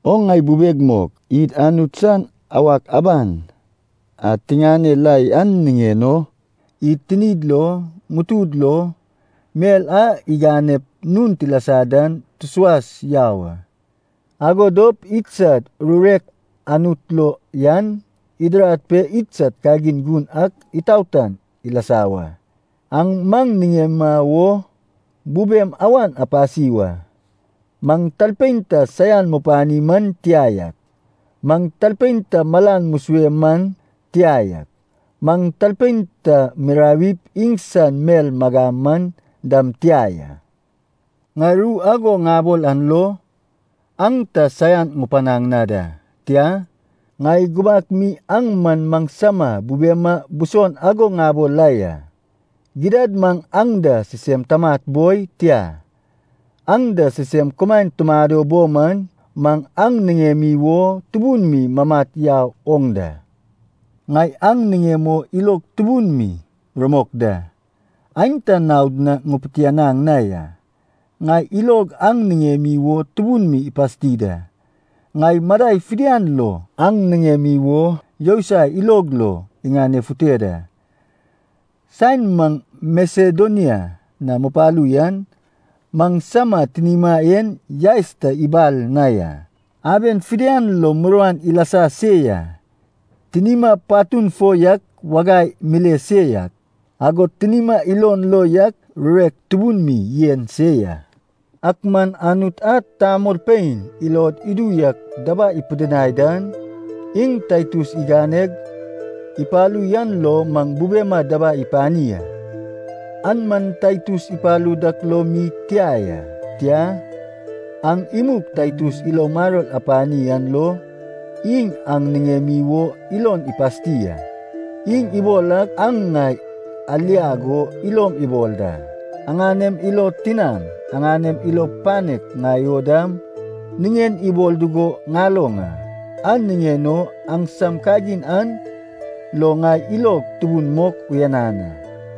O ŋai bubeg mok, id Anut san awak aban a tiŋane la yan niŋen o, id tinid lo, ŋutud lo, mel a iganep nun tilasa dan tusuas yau a. Ago dop idsad rurek Anut lo yan idirad pe idsad kagin gun ak itaotan ilasa wa. Aŋ maŋ niŋema wo bubem awan apasi wa. Maŋ talpein ta saian mupani man tia yak, maŋ talpein ta malan musue man tia yak, maŋ talpein ta mirawip iŋsan mel magam man dam tia ya. Ŋai ru ago ŋabol an lo, aŋ ta saian ŋupanaŋ na da. Tia, ŋai gubak mi aŋ man maŋsama bubema buson ago ŋabol la ya. Gidad maŋ aŋ da sisem tamat boi, tia, aŋ da sisem kumaen tumado bo man, maŋ aŋ niŋemi wo tubun mi mamat yau oŋ da. Ŋai aŋ niŋem o ilog tubun mi rumok da, aenta naod na ŋupitianaŋ na ya, ŋai ilog aŋ niŋemi wo tubun mi ipasti da. Ŋai madai fidian lo aŋ niŋemi wo yousai ilog lo iŋanefute da. Saen maŋ Masedonia na mupalu yan, maŋsama tinima en yaes ta ibal na ya. Aben fidian lo muruan ilasa se ya, tinima patun fo yak wagai mile se yak, agod tinima ilon lo yak rurek tubun mi yen se ya. Ak man Anut a tamolpein ilod idu yak dabai ipidinai dan, iŋ Taitus iganeg ipalu yan lo maŋ bubema dabai ipani a. An man Taitus ipalu dak lo mi tia ya, tia, aŋ imug Taitus ilo maror apani an lo, iŋ aŋ niŋemi wo ilon ipasti a. Iŋ ibol ak aŋ ŋai aliag o ilom ibol da. Aŋanem ilo tinaŋ, aŋanem ilo panek ŋai o dam niŋen ibol dugo ŋaloŋ a. An niŋen o aŋsam kagin an lo ŋai ilog tubun mok uyanan a.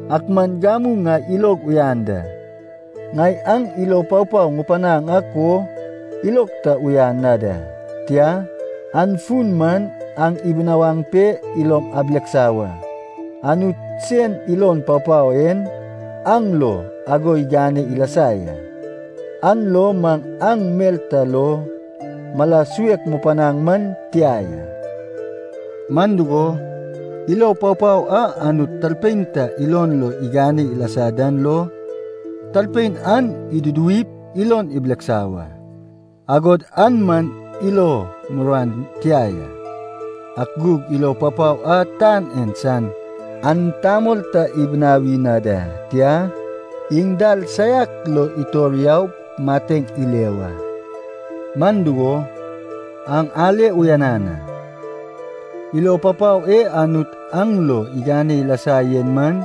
Ak man gamu ŋai ilog uyan da, ŋai aŋ ilo papao ŋupanaŋ ak o ilog ta uyan na da, tia, an fun man aŋ ibinawaŋ pe ilom abileksa wa. Anut sen ilo papao en aŋ lo ago igane ilasa ya, an lo maŋ aŋ mel ta lo mala suek mupanaŋ man tia ya. Man dugo, ilo papao a Anut talpein ta ilon lo igane ilasa dan lo talpein an iduduwip ilon ibileksa wa. Agod an man ilo muruan tia ya. Ak gug ilo papao a tan en san an tamol ta ibinawi na da, tia, iŋ dal saiak lo itor yaup mateŋ ile wa. Man dugo, aŋ ale uyanan a, ilo papao e Anut aŋ lo igane ilasa yen man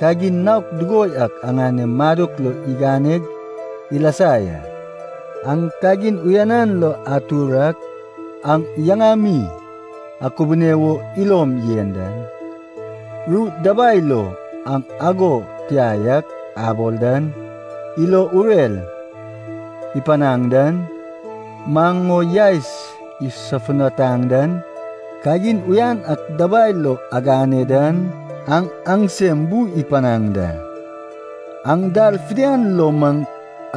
kagin naok dugo yak aŋanem madok lo iganeg ilasa ya. Aŋ kagin uyanan lo atur ak, aŋ yaŋami akubune wo ilom yen dan, ru dabai lo aŋ “ago tia yak” abol dan, ilo urer ipanaŋ dan, maŋ o yaes isofutanaŋ dan, kagin uyan ak dabai lo agane dan, aŋ aŋsem bu ipanaŋ da. Aŋ dal fidian lo maŋ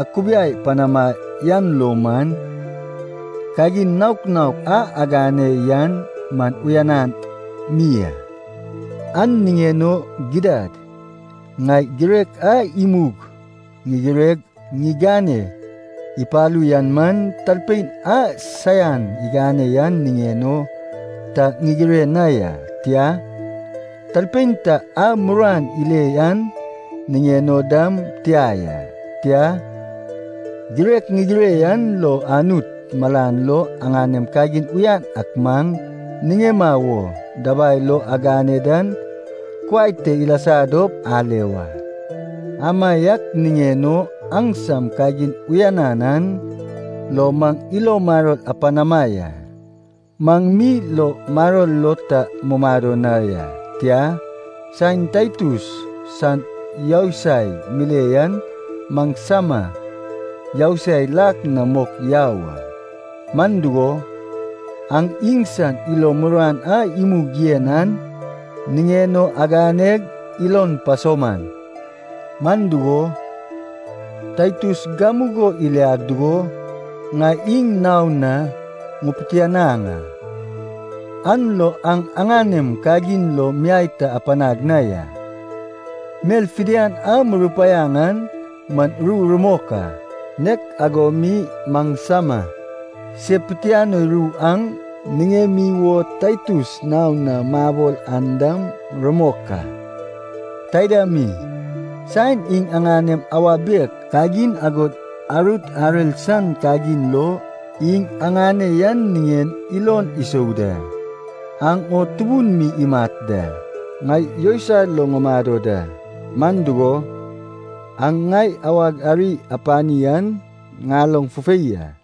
akubiai panama yan lo man, kagin naok naok a agane yan man uyanan mi a. An niŋen o gidad ŋai girek a imug ŋigireg ŋigane ipalu yan man, talpein a saian igane yan niŋen o ta ŋigire na ya, tia, talpein ta a muruan ile yan niŋen o dam tia ya. Tia, girek ŋigire yan lo Anut malan lo aŋanem kagin uyan ak maŋ niŋema wo dabai lo agane dan kuai te ilasa dop ale wa. Amaiak niŋen o aŋsam kagin uyanan an lo maŋ ilo maror apanama ya. Maŋ mi ilo maror lo ta mumado na ya, tia, saen Taitus san yousai mile yan maŋsama yousai lak na mok yau a. Man dugo, aŋ iŋsan ilo muruan a imug yen an niŋen o aganeg ilon pasauman. Man dugo, Taitus gamugo iliaŋ dugo ŋai iŋ naon na ŋupitianaŋ a, an lo aŋ aŋanem kagin lo miai ta apanag na ya. Mel fidian a murupaiaŋ an man ru rumok a, nek ago mi maŋsama se pitianoi ru aŋ niŋemi wo Taitus naon na mabol an dam rumok a. Taida mi, saen iŋ aŋanem awa bek kagin agod arut arer san kagin lo iŋ aŋane yan niŋen ilon isou da, aŋ o tubun mi imat da. Ŋai yousai lo ŋumado da, man dugo, aŋ ŋai awag ari apani an ŋaloŋ fufei a.